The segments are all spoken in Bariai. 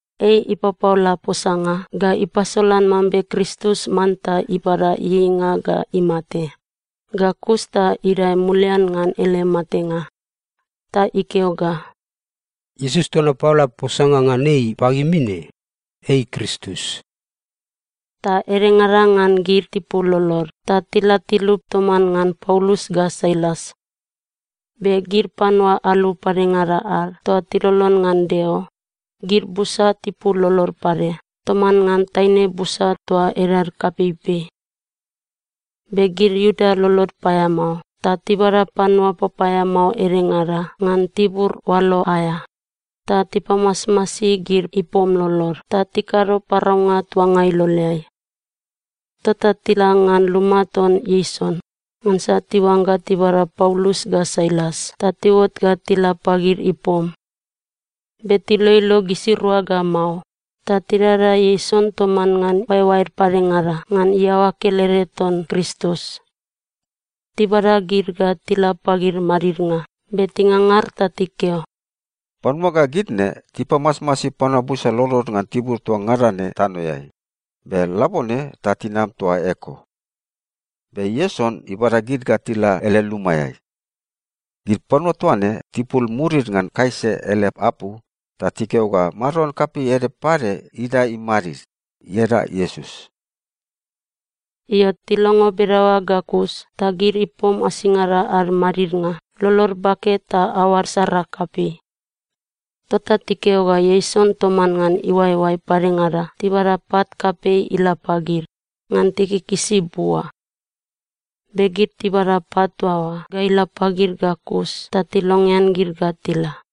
Ei ipapaola posanga ga ipasolan mambe Kristus manta ibada ieieinga ga imate, ga kus ta idae mulian ngan ele matenga. Ta ikeo ga, “Iesus toa napaola posanga ngan ei pagimi ne, ei Kristus.” Ta edengada ngan gid tipul lolod ta tila tilup toman ngan Paulus ga Sailas. Be gid panua alu padengada ad toa tilolon ngan Deo, gid busa tipul lolod pade toman ngan taine busa toa edad kapeipei. Be gid Iuda lolod paeamao ta tibada panua papaeamao edengada ngan tibur oalo aea ta tipamasmasi gid ipom lolod ta tikado paraunga tuanga iloleai. Tota tila ngan luma ton Ieson ngansa tiuangga tibada Paulus ga Sailas ta tiuot ga tila pagid ipom. Be tiloilo gisirua ga mao, ta tidada Ieson toman ngan oaeoaed padengada ngan iaoa kelede ton Kristus. Tibada gid ga tila pagid madidnga be tingangar ta tikeo, “Panua ga gid ne tipamasmasi panua busa lolod ngan tibur toa ngada ne tanoeai, be labone ta tinam toa eko! Be Ieson ibada gid ga tila ele lumaeai. Gid panua toa ne tipul murid ngan Kaisa ele apu ta tikeo ga maron kapei ede pade idae imadid, ieda Iesus.” Io, tilongo bedaoa ga kus ta gid ipom asingada ad madidnga lolod bake ta aoad sara kapei. Tota tikeo ga Ieson toman ngan iuaeoae padengada tibada pat kapei ila pagid, ngan tikikisi bua. Be gid tibada pat toa oa ga ila pagid ga kus ta tilongean gid ga tila.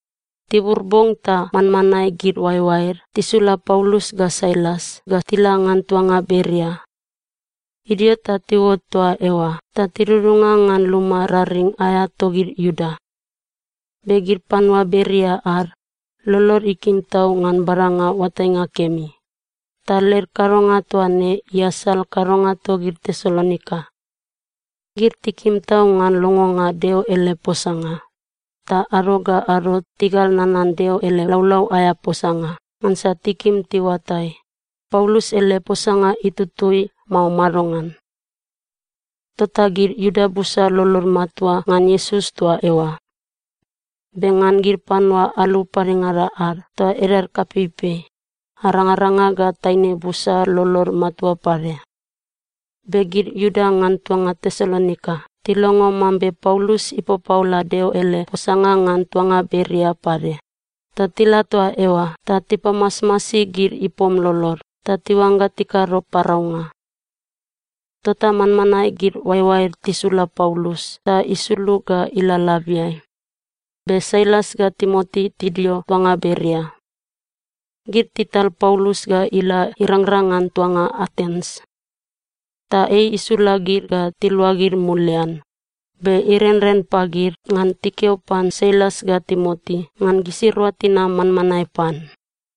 Tibur bong ta manmanae gid oaeoaed tisula Paulus ga Sailas ga tila ngan tuanga Beria. Idio ta tiuot toa eoa ta tidudunga ngan luma raring aea togid Iuda. Be gid panua Beria ad, lolod ikim tau ngan badanga oatainga kemi, ta led kadonga toa ne iasal kadonga togid Tesalonika. Gid tikim tau ngan longonga Deo ele posanga, ta ado ga ado tigal nanan Deo ele laulau aea posanga ngansa tikim tiuatai, Paulus ele posanga itutui, mao madongan. Tota gid Iuda busa lolod matua ngan Iesus toa eoa. Be ngan gid panua alu padengada ad toa edad kapeipei, arangaranga ga taine busa lolod matua pade. Be gid Iuda ngan tuanga Tesalonika tilongo mambe Paulus ipapaola Deo ele posanga ngan tuanga Beria pade, ta tila toa eoa ta tipamasmasi gid ipom lolod ta tiuangga tikado paraunga. Tota manmanae gid oaeoaed tisula Paulus ta isulug ga ila labiai, be Sailas ga Timoti tidio tuangai Beria. Gid tital Paulus ga ila irangrang ngan tuanga Atens. Ta ei isula gid ga tiluagid mulian, be irenren pagid ngan tikeo pan Sailas ga Timoti ngan gisirua tinam manmanae pan.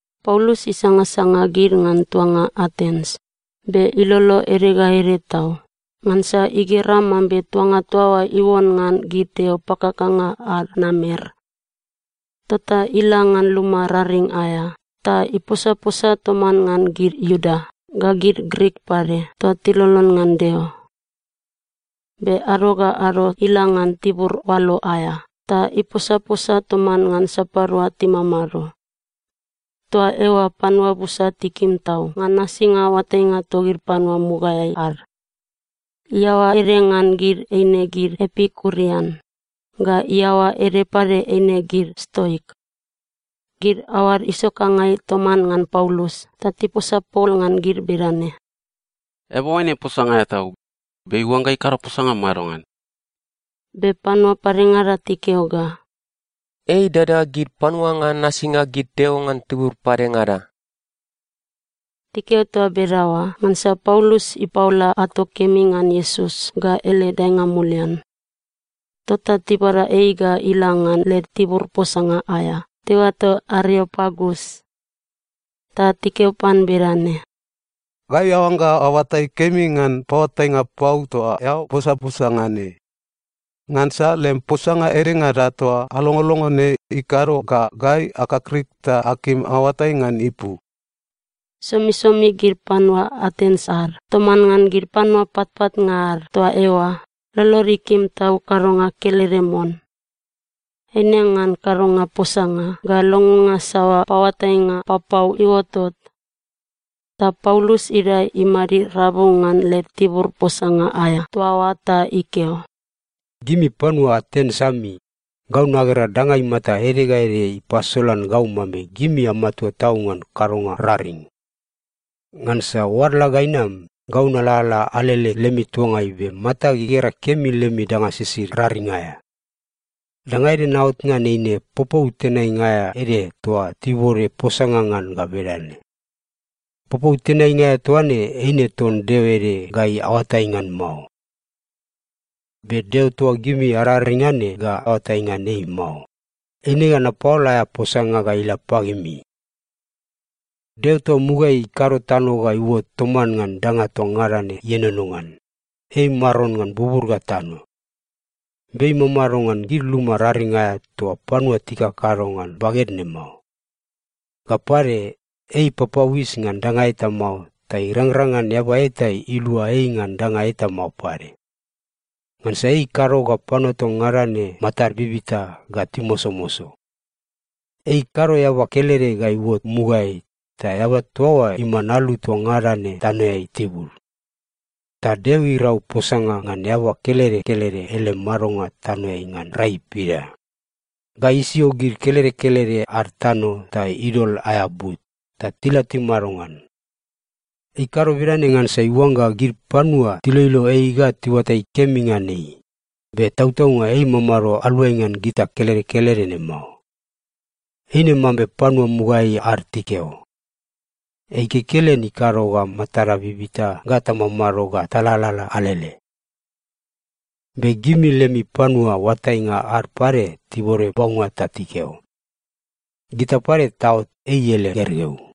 Paulus isangasanga gid ngan tuanga Atens, be ilolo ede ga ede tau ngansa igera mambe tuanga toa oa iuon ngan gid deo pakakanga ad namer. Tota ila ngan luma raring aea ta iposaposa toman ngan gid Iuda ga gid Grik pade toa tilolon ngan Deo. Be ado ga ado ila ngan tibur oalo aea ta iposaposa toman ngan sapadua timamado. Toa eoa panua busa tikim tau ngan nasinga oatainga togid panua mugaeai ad. Iaoa ede ngan gid eine gid Epikurian ga iaoa ede pade eine gid Stoik. Gid aoad isokangai toman ngan Paulus ta tiposa pol ngan gid bedane, “Eaba oaine posanga aea tau, be iuangga ikado posanga madongan?” Be panua padengada tikeo ga, “Ei idada gid panua ngan nasinga gid deo ngan tibur padengada.” Tikeo toa bedaoa ngansa Paulus ipaola ato kemi ngan Iesus ga ele daenga mulian. Tota tibada ei ga ila ngan led tibur posanga aea tiuato Areopagus. Ta tikeo pan bedane, “Gai aoangga aoatai kemi ngan paoatainga pau toa eao posaposa ngan ne. Ngansa lem posanga edengada toa alongolongo ne ikado ga gai akakrik ta akim aoatai ngan ipu.” Somisomi gid panua Atens ad toman ngan gid panua patpatnga ad toa eoa lolod ikim tau kadonga kelede mon. Eine ngan kadonga posanga ga longonga saoa paoatainga papau iuotot. Ta Paulus idae imadid rabu ngan led tibur posanga aea toa oa ta ikeo, “Gimi panua Atens ami, gau nagera danga imata ede ga ede ipasolan gau mambe gimi amatua tau ngan kadonga raring. Ngansa oadla ga inam, gau nalalala alele lemi tuangai be matag igera kemi lemi danga sisid raring aea. Danga ede naot ngan eine popou tenainga aea ede toa tibode posanga ngan ga bedane, ‘Popou tenainga aea toa ne, eine ton deo ede gai aoatai ngan mao.’ Be Deo toa gimi araring ngan ne ga aoatai ngan ei mao, eine ga napaola aea posanga ga ila pagimi. “Deo toa mugaeai ikado tano ga iuot toman ngan danga toa ngada ne ienono ngan, ei Maron ngan bubur ga tano. Be ei imamado ngan gid luma raring aea toa panua tikakado ngan baged ne mao. Ga pade, ei ipapauis ngan danga eta mao ta irangrang ngan eaba eta ilua ei ngan danga eta mao pade. Ngansa ei ikado ga panua toa ngada ne matad bibita ga timosomoso. Ei ikado eaba kelede ga iuot mugaeai, ta eaba toa oa iman alu toa ngada ne tanoeai tibud. Ta Deo irau posanga ngan eaba kelede kelede ele madonga tanoeai ngan rai pida. Ga isio gid kelede kelede ad tano ta idol aea but, ta tila timado ngan. Ei ikado bedane ngansa iuangga gid panua tiloilo ei ga tiuatai kemi ngan ei, be tautaunga ei imamado aluai ngan gita kelede kelede ne mao. Eine mambe panua mugaeai ad tikeo, ‘Ei kekelen ikado ga matada bibita ga tamamado ga talalala alele.’ Be gimi lemi panua oatainga ad pade tibode baunga ta tikeo, ‘Gita pade taot ei ele gergeu.’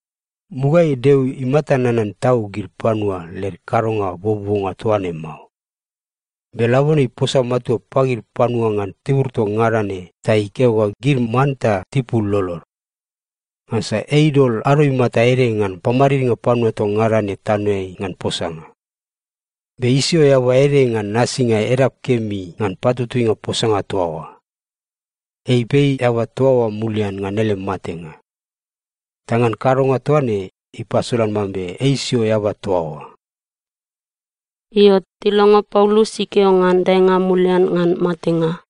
Mugaeai Deo imata nanan tau gid panua led kadonga buobuonga toa ne mao. Be labone iposa matua pagid panua ngan tibur toa ngada ne ta ikeo ga gid manta tipul lolod. Ngansa ei idol ado imata ede ngan pamadidnga panua toa ngada ne tanoeai ngan posanga. Be isio eaba ede ngan nasinga edap kemi ngan patutuinga posanga toa oa. Ei ipei eaba toa oa mulian ngan ele matenga. Ta ngan kadonga toa ne, ipasolan mambe ei isio eaba toa oa.” Io, tilongo Paulus ikeo ngan daenga mulian ngan matenga,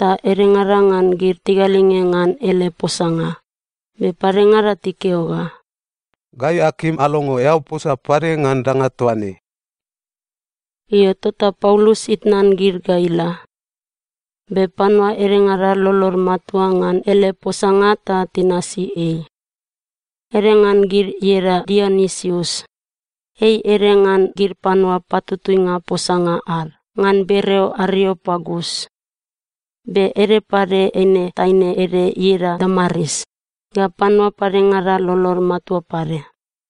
ta edengada ngan gid tigalinge ngan ele posanga, be padengada tikeo ga, “Gai akim alongo eao posa pade ngan danga toa ne.” Io, tota Paulus itnan gid ga ila. Be panua edengada lolod matua ngan ele posanga ta tinasi ei. Ede ngan gid ieda Dionisius. Ei ede ngan gid panua patutuinga posanga ad ngan bereo Areopagus. Be ede pade eine taine ede ieda Damaris, ga panua padengada lolod matua pade.